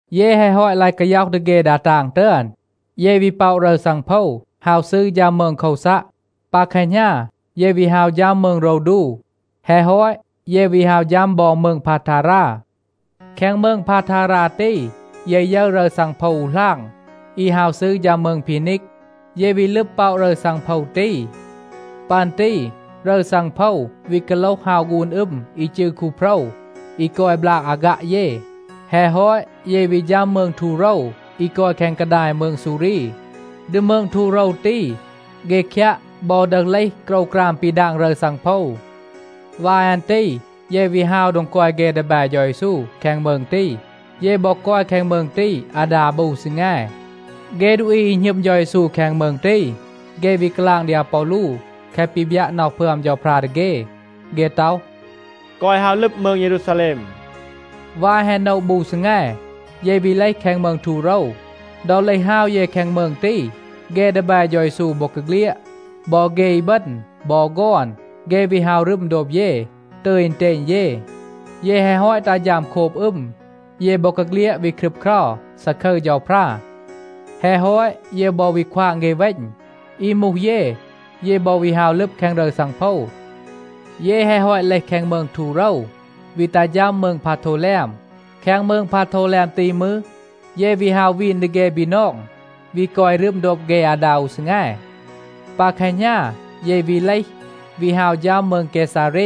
เย แฮะ ฮอต ลาย กาย็อห ดี เฆ ดา ตาง ตึอน, เย วี ป็อะ รึร ซังโพว ฮาว ซืร ฌัม มืง โควซัะ. ปา แคหณา เย วี ฮาว ฌัม มืง โรวดู, แฮะ ฮอต, เย วี ฮาว ฌัม บอ มืง พาทารา. แคง มืง พาทารา ตี, เย ยึร รึร ซังโพว อู หลาง, อี ฮาว ซืร ฌัม มืง พีนีก. เย วี ลึบ ป็อะ รึร ซังโพว ตี. ปัน ตี รึร ซังโพว วี กาโลห ฮาว ฆูน อึม อี จืร คูโพรว อี กอย บลาก อาฆัะ เย. แฮะ ฮอต, เย วี ฌัม มืง ทูโรว, อี กอย แคง กาดาย มืง ซูรี. ดี มืง ทูโรว ตี, เฆ คยัะ บอ ดึห เลห โกรวกราม ปี ดาง รึร ซังโพว. วาย อัน ตี เย วี ฮาว โดง กอย เฆ ดีแบ เฌา เยซู แคง มืง ตี. เย บอ กอย แคง มืง ตี อาดา บู ซีแง. เฆ ดูอี อี หณึม เฌา เยซู แคง มืง ตี, เฆ วี กาลาง ดี อาปอลู แคะ ปี บยัะ น็อห พึอม เฌาพรา ดี เฆ. เฆ ต็อห, “แกวะ ฮาว ลึบ มืง เยรูซาแลม.” วาย แฮะ โนะ บู ซีแง, เย วี เลห แคง มืง ทูโรว. ดอ เลห ฮาว เย แคง มืง ตี, เฆ ดีแบ เฌา เยซู บอกาเฆลียด, บอ เฆ อีบึณ บอ ฆอน, เฆ วี ฮาว รึม โดบ เย, ตึย อึณเตณ เย. เย แฮะ ฮอต ตัห ฌัม โคบ อึม, เย บอกาเฆลียด วี ครึบเครา, ซาคึร เฌาพรา. แฮะ ฮอต, เย บอ วี ควาง เฆ เวณ. อี มูห เย, เย บอ วี ฮาว ลึบ แคง รึร ซังโพว. เย แฮะ ฮอต เลห แคง มืง ทูโรว, วี ตัห ฌัม มืง พาโทวแลม. แคง มืง พาโทวแลม ตี มืร, เย วี ฮาว วีน ดี เฆ บีนอง, วี กอย รึม โดบ เฆ อาดา อู ซีแง. ปา แคหณา เย วี เลห, วี ฮาว ฌัม มืง เกซาเร.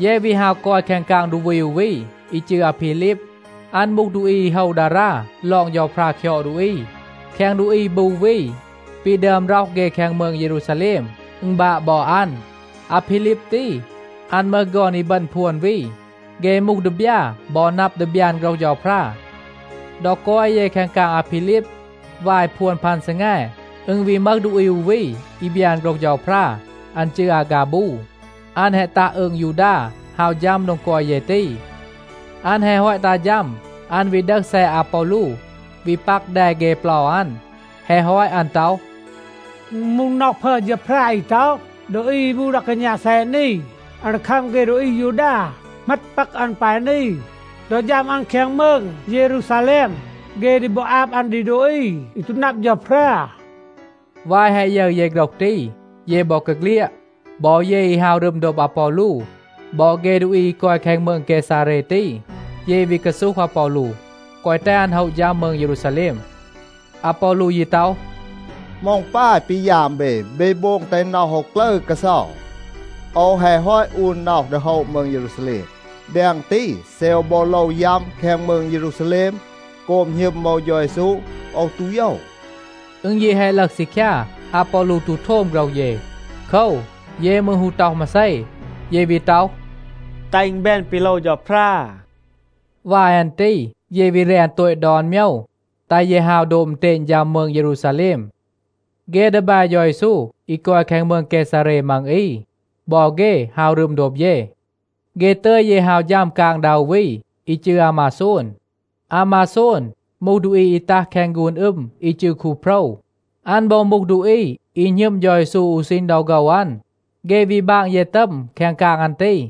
เย วี ฮาว กอย แคง กาง ดูอี อู วี อี จืร อาพีลีบ. อัน มูห ดูอี อี โฮว ดารา ลอง เฌาพรา คยอด ดูอี. แคง ดูอี บู วี ปี ดึอม ร็อห เฆ แคง มืง เยรูซาแลม, อึณ บาะ บอ อัน. อาพีลีบ ตี, อัน มึห ฆอน อีบึณ พวน วี. เฆ มูห ดีบยา บอ นับ ดี บยาน โฆรห เฌาพรา. ดอ กอย เย แคง กาง อาพีลีบ, วาย พวน พัน ซีแง, อึณ วี มึห ดูอี อู วี อี บยาน โฆรห เฌาพรา. อัน จืร อาฆาบู. อัน แฮะ ตัห อืง ยูดา ฮาว ฌัม โดง กอย เย ตี. อัน แฮะ ฮอต ตัห ฌัม, อัน วี ดึห แซะ อาปอลู, วี ปัก แด เฆ เปลา อัน. แฮะ ฮอต อัน ต็อห, “อึณ มูห น็อห พึอม เฌาพรา อี ต็อห, ‘ดูอี อี มูห ดา กาณา แซะ นี, อัน ดี คัม เฆ ดูอี อายูดา เหมต ปัก อัน ปาย นี ดอ ฌัม อัน แคง มืง เยรูซาแลม. เฆ ดี บอ อาบ อัน ดี ดูอี อี ตู นับ เฌาพรา.’” วาย แฮะ ยึร เย โฆรห ตี, เย บอกาเฆลียด, บอ เย อี ฮาว รึม โดบ อาปอลู, บอ เฆ ดูอี อี กอย มืง เกซาเร ตี, เย วี กาซูห อาปอลู, แกวะ แตห อัน โฮะ ฌัม มืง เยรูซาแลม. อาปอลู ยี ต็อห, “เหมา อึณ ปาย ปี ยาม เบ? เบ โบง แตห น็อห โอว กลึร กาเซา. โอว แฮะ ฮอต อูน น็อห ดี โฮะ มืง เยรูซาแลม. แดง ตี, เซ โอว บอ โลว ยัม แคง มืง เยรูซาแลม โกบ หณึม โอว เฌา เยซู, โอว ตู โยว.” อึณ ยี แฮะ ลึห ซีคยา, อาปอลู ตู โทม โฆรห เย. โคว, เย มืร ฮู ต็อห มาเซ. เย วี ต็อห, “แตห อึณ แบน ปี โลว เฌาพรา.” วาย อัน ตี เย วี แรน โตต ดอน โมยว, แตห เย ฮาว โดบ อึณเตณ ฌัม มืง เยรูซาแลม. เฆ ดีแบ เฌา เยซู อี กอย แคง มืง เกซาเร มัง อี, บอ เฆ ฮาว รึม โดบ เย. เฆ ตึย เย ฮาว ฌัม กาง ดา อู วี อี จืร อามาโซน. อามาโซน มูห ดูอี อี ตัห แคง ฆูน อึม อี จืร คูโพรว. อัน บอ มูห ดูอี อี หณึม เฌา เยซู อู ซีณ ดอ โฆว อัน. เฆ วี บาง เย ตัม แคง กาง อัน ตี.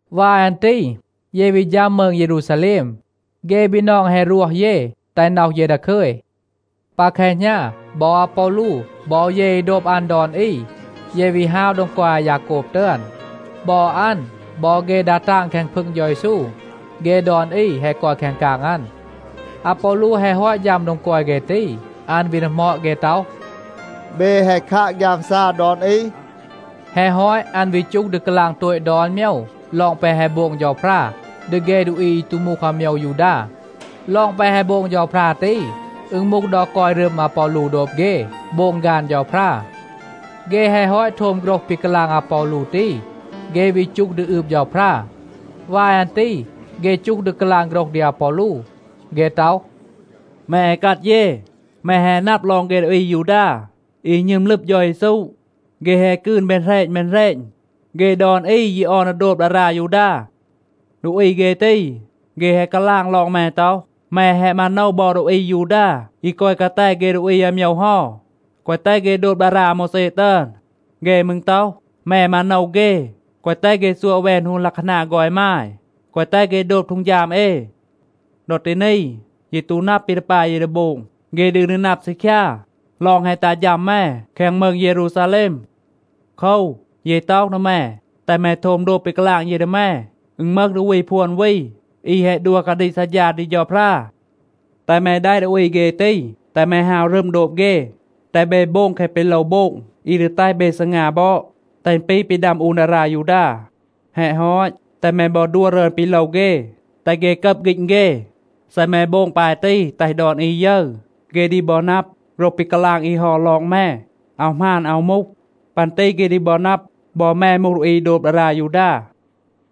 วาย อัน ตี เย วี ฌัม มืง เยรูซาแลม. เฆ บีนอง แฮะ รวห เย, แตห น็อห เย ดาคึย. ปา แคหณา, บอ อาปอลู บอ เย อี โดบ อัน ดอน อี, เย วี ฮาว โดง กอย อายาโกบ ตึอน. บอ อัน บอ เฆ ดา ตาง แคง พึง เฌา เยซู, เฆ ดอน อี แฮะ กอย แคง กาง อัน. อาปอลู แฮะ ฮอต ฌัม โดง กอย เฆ ตี, อัน วี ดีหมอด เฆ ต็อห, “เบ แฮะ คัะ ฆยามซา ดอน อี?” แฮะ ฮอต, อัน วี จูห ดี กาลาง โตต ดอน โมยว ลอง แปะ แฮะ โบง เฌาพรา ดี เฆ ดูอี อี ตู มูห อาโมยว ยูดา. ลอง แปะ แฮะ โบง เฌาพรา ตี, อึณ มูห ดอ กอย รึม อาปอลู โดบ เฆ, โบง ฆาน เฌาพรา. เฆ แฮะ ฮอต โทม โฆรห ปี กาลาง อาปอลู ตี, เฆ วี จูห ดี อืบ เฌาพรา. วาย อัน ตี เฆ จูห ดี กาลาง โฆรห ดี อาปอลู. เฆ ต็อห, “แม อีกัด เย, แม แฮะ นับ ลอง เฆ ดูอี อายูดา อี หณึม ลึบ เฌา เยซู. เฆ แฮะ กืน แบน แหรณ แบน แหรณ. เฆ ดอน อี ยี ออน ดี โดบ ดารา ยูดา. ดูอี เฆ ตี, เฆ แฮะ กาลาง ลอง แม ต็อห, แม แฮะ มาโนว บอ ดูอี อายูดา อี กอย กาแต เฆ ดูอี อาโมยว เฮา, แกวะ แตห เฆ โดบ ดารา อาโมวแซ ตึอน. เฆ มืร ต็อห, แม มาโนว เฆ, แกวะ แตห เฆ ซัวะ แวน ฮูน ลัะคานา ฆอน อีมาย, แกวะ แตห เฆ โดบ ฮีด เอ. ดอ ตี นี, เย ตู นับ ปี ดี ปาย เย ดี โบง. เฆ ดืน ดี นับ ซีคยา ลอง แฮะ ตัห ฌัม แม แคง มืง เยรูซาแลม. โคว, เย ต็อห ดี แม, แตห แม โทม โดบ ปี กาลาง เย ดี แม. อึณ มึห ดูอี พวน วี, อี แฮะ ดัว กาดีก ซัดฌา ดี เฌาพรา. แตห แม แดะ ดูอี เฆ ตี, แตห แม ฮาว รึม โดบ เฆ, แตห เบ โบง แคะ ปี โลว โบง อี ดี แตห เบ ซีงา บอด, แตห อึณ ปี ปี ดัม อูน ดารา ยูดา. แฮะ ฮอต, แตห แม บอ ดัว รึอน ปี โลว เฆ, แตห เฆ กับ ฆีณ เฆ. เซ แม โบง ปาย ตี แตห ดอน อี ยึร, เฆ ดี บอ นับ, โฆรห ปี กาลาง อี เฮา ลอง แม อาว หมาน, อาว มูห. ปัน ตี เฆ ดี บอ นับ, บอ แม มูห ดูอี อี โดบ ดารา ยูดา.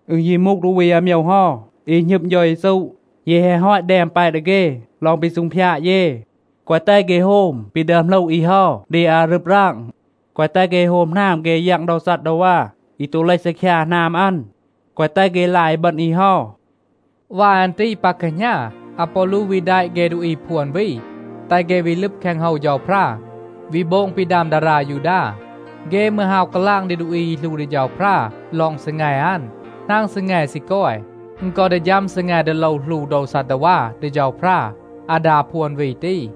อึณ ยี มูห ดูอี อาโมยว เฮา, อี หณึม เฌา เยซู, เย แฮะ ฮอต แดม แปะ ดี เฆ ลอง ปี ซูงพยาด เย. แกวะ แตห เฆ โฮม ปี ดึอม หลู อี เฮา ดี อารึบ ราง. แกวะ แตห เฆ โฮม หนาม เฆ ยัง โดว ซัดดาวา อี ตู เลห ซีคยา หนาม อัน. แกวะ แตห เฆ ลาย อีบึณ อี เฮา.” วาย อัน ตี ปา แคหณา, อาปอลู วี แดะ เฆ ดูอี พวน วี, แตห เฆ วี ลึบ แคง โฮว เฌาพรา, วี โบง ปี ดัม ดารา ยูดา. เฆ มืร ฮาว กาลาง ดี ดูอี อี หลู ดี เฌาพรา ลอง ซีแง อัน, หนาง ซีแง ซี กอย, อึณ กอ ดี ฌัม ซีแง ดี โลว หลู โดว ซัดดาวา ดี เฌาพรา อาดา พวน วี ตี.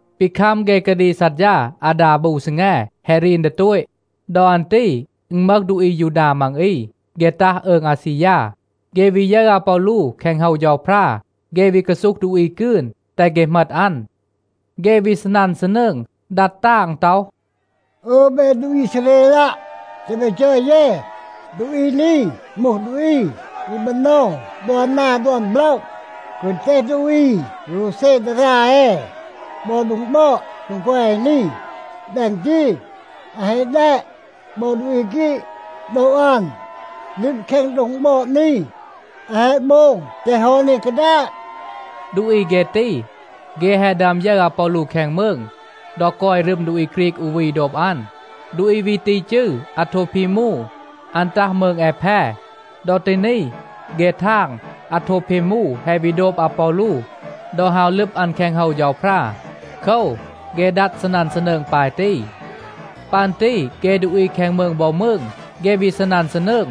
ปี คัม เฆ กาดีก ซัดฌา อาดา บู ซีแง, แฮะ รีน ดี โตต. ดอ อัน ตี อึณ มึห ดูอี อายูดา มัง อี. เฆ ตัห อืง อาซียา. เฆ วี ยึร อาปอลู แคง โฮว เฌาพรา, เฆ วี กาซูห ดูอี กืน, แตห เฆ เหมต อัน. เฆ วี ซีนัน ซีนืง, ดัด ตาง ต็อห, “อึย เบ ดูอี อีซาเรลัะ, แตห เบ จอย เย. ดูอี นี มูห ดูอี อี มาโนว ดอน นา ดอน โปละ, แกวะ แตห ดูอี โรวเซ ดารา เอ บอ โดง บอด, โดง กอย เอ นี. แดง ตี, อัน แฮะ แดะ บอ ดูอี ฆรีก โดบ อัน, ลึบ แคง โดง บอด นี. อัน แฮะ โบง แตห โฮว นี กาดาต.” (ดูอี เฆ ตี, เฆ แฮะ ดึอม ยึร อาปอลู แคง มืง, ดอ กอย รึม ดูอี ฆรีก อู วี โดบ อัน. ดูอี วี ตี จืร อาโทพีมู. อัน ตัห มืง แอแพ. ดอ ตี นี, เฆ ทาง, อาโทพีมู แฮะ วี โดบ อาปอลู ดอ ฮาว ลึบ อัน แคง โฮว เฌาพรา. โคว, เฆ ดัด ซีนัน ซีนืง ปาย ตี.) ปัน ตี เฆ ดูอี แคง มืง บอ มืง, เฆ วี ซีนัน ซีนืง.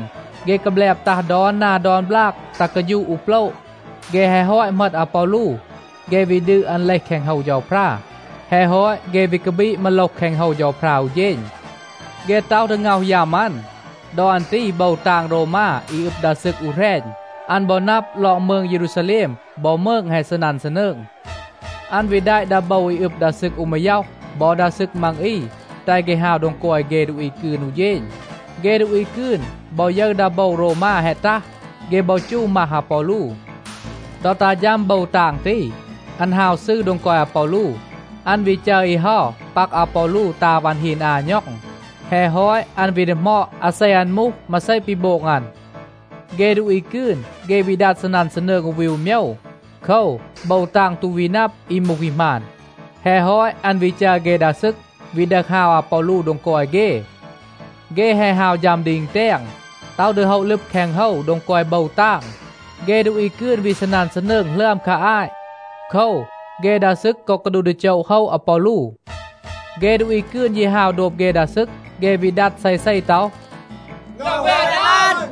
เฆ กาแบลบ ตัห ดอน นา ดอน บลาก, ตัห กาฌูะ อู โปละ. เฆ แฮะ ฮอต เหมต อาปอลู, เฆ วี ดืด อัน เลห แคง โฮว เฌาพรา. แฮะ ฮอต, เฆ วี กาบีด มาโลห แคง โฮว เฌาพรา อู เฌณ. เฆ ต็อห ดี ง็อห ยัม อัน. ดอ อัน ตี โบว ตาง โรวมา อี อึบ ดา ซึก อู แหรณ, อัน บอ นับ ลอง มืง เยรูซาแลม บอ มืง แฮะ ซีนัน ซีนืง. อัน วี แดะ ดา โบว อี อึบ ดา ซึก อู มาย็อห บอ ดา ซึก มัง อี, แตห เฆ ฮาว โดง กอย เฆ ดูอี กืน อู เฌณ. เฆ ดูอี กืน บอ ยึร ดา โบว โรวมา แฮะ ตัห, เฆ บอ จู มัห อาปอลู. ดอ ตัห ฌัม โบว ตาง ตี, อัน ฮาว ซืร โดง กอย อาปอลู. อัน วี จัร อี เฮา ปัก อาปอลู ตา วัน ฮีน อา ณ็อง. แฮะ ฮอต, อัน วี ดีหมอด, อาเซ อัน มูห, มาเซ ปี โบง อัน. เฆ ดูอี กืน, เฆ วี ดัด ซีนัน ซีนืง อู วี อู โมยว. โคว, โบว ตาง ตู วี นับ อี มูห อี หมาน. แฮะ ฮอต, อัน วี จัร เฆ ดา ซึก วี ดึห ฮาว อาปอลู โดง กอย เฆ. เฆ แฮะ ฮาว ฌัม ดี อึณแตง, ต็อห ดี โฮะ ลึบ แคง โฮว โดง กอย โบว ตาง, เฆ ดูอี กืน วี ซีนัน ซีนืง หลึอม คา อาต. โคว, เฆ ดา ซึก กอ กาดูห ดี โจะ โฮะ อาปอลู. เฆ ดูอี กืน ยี ฮาว โดบ เฆ ดา ซึก. เฆ วี ดัด เซเซ ต็อห, “ง็อห แวน อัน.”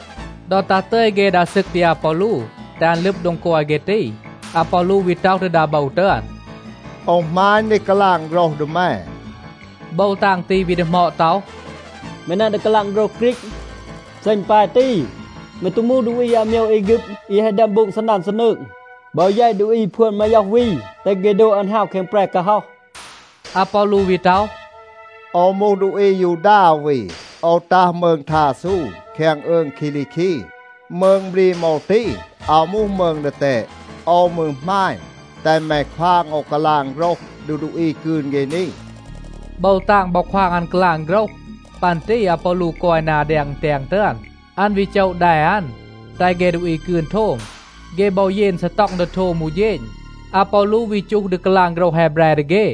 ดอ ตัห ตึย เฆ ดา ซึก ดี อาปอลู, แตห อัน ลึบ โดง กอย เฆ ตี, อาปอลู วี ต็อห ดี ดา โบว ตึอน, “โอว หมาณ ดี กาลาง โฆรห ดี แม.” โบว ตาง ตี วี ดีหมอด ต็อห, “แม นับ ดี กาลาง โฆรห ฆรีก? เซ อึณ ปาย ตี, แม ตู มูห ดูอี อาโมยว แอฆึบ อี แฮะ ดึอม โบง ซีนัน ซีนืง, บอ แยต ดูอี พวน มาย็อห วี, แตห เฆ โดบ อัน ฮาว แคง แปร กาฮ็อห?” อาปอลู วี ต็อห, “โอว มูห ดูอี อายูดา อู วี. โอว ตัห มืง ทาซู แคง อืง คีลีคี. มืง บรีม โอว ตี, อาว มูห มืง ดีแตด. โอว มืร หมาณ, แตห แม ควาง โอว กาลาง โฆรห ดี ดูอี กืน เฆ นี.” โบว ตาง บอ ควาง อัน กาลาง โฆรห. ปัน ตี อาปอลู กอย นา แดง อึณแตง ตึอน. อัน วี โจะ แด อัน, แตห เฆ ดูอี กืน โทม. เฆ บอ เยน ซีต็อง ดี โทม อู เฌณ. อาปอลู วี จูห ดี กาลาง โฆรห แฮแบร ดี เฆ.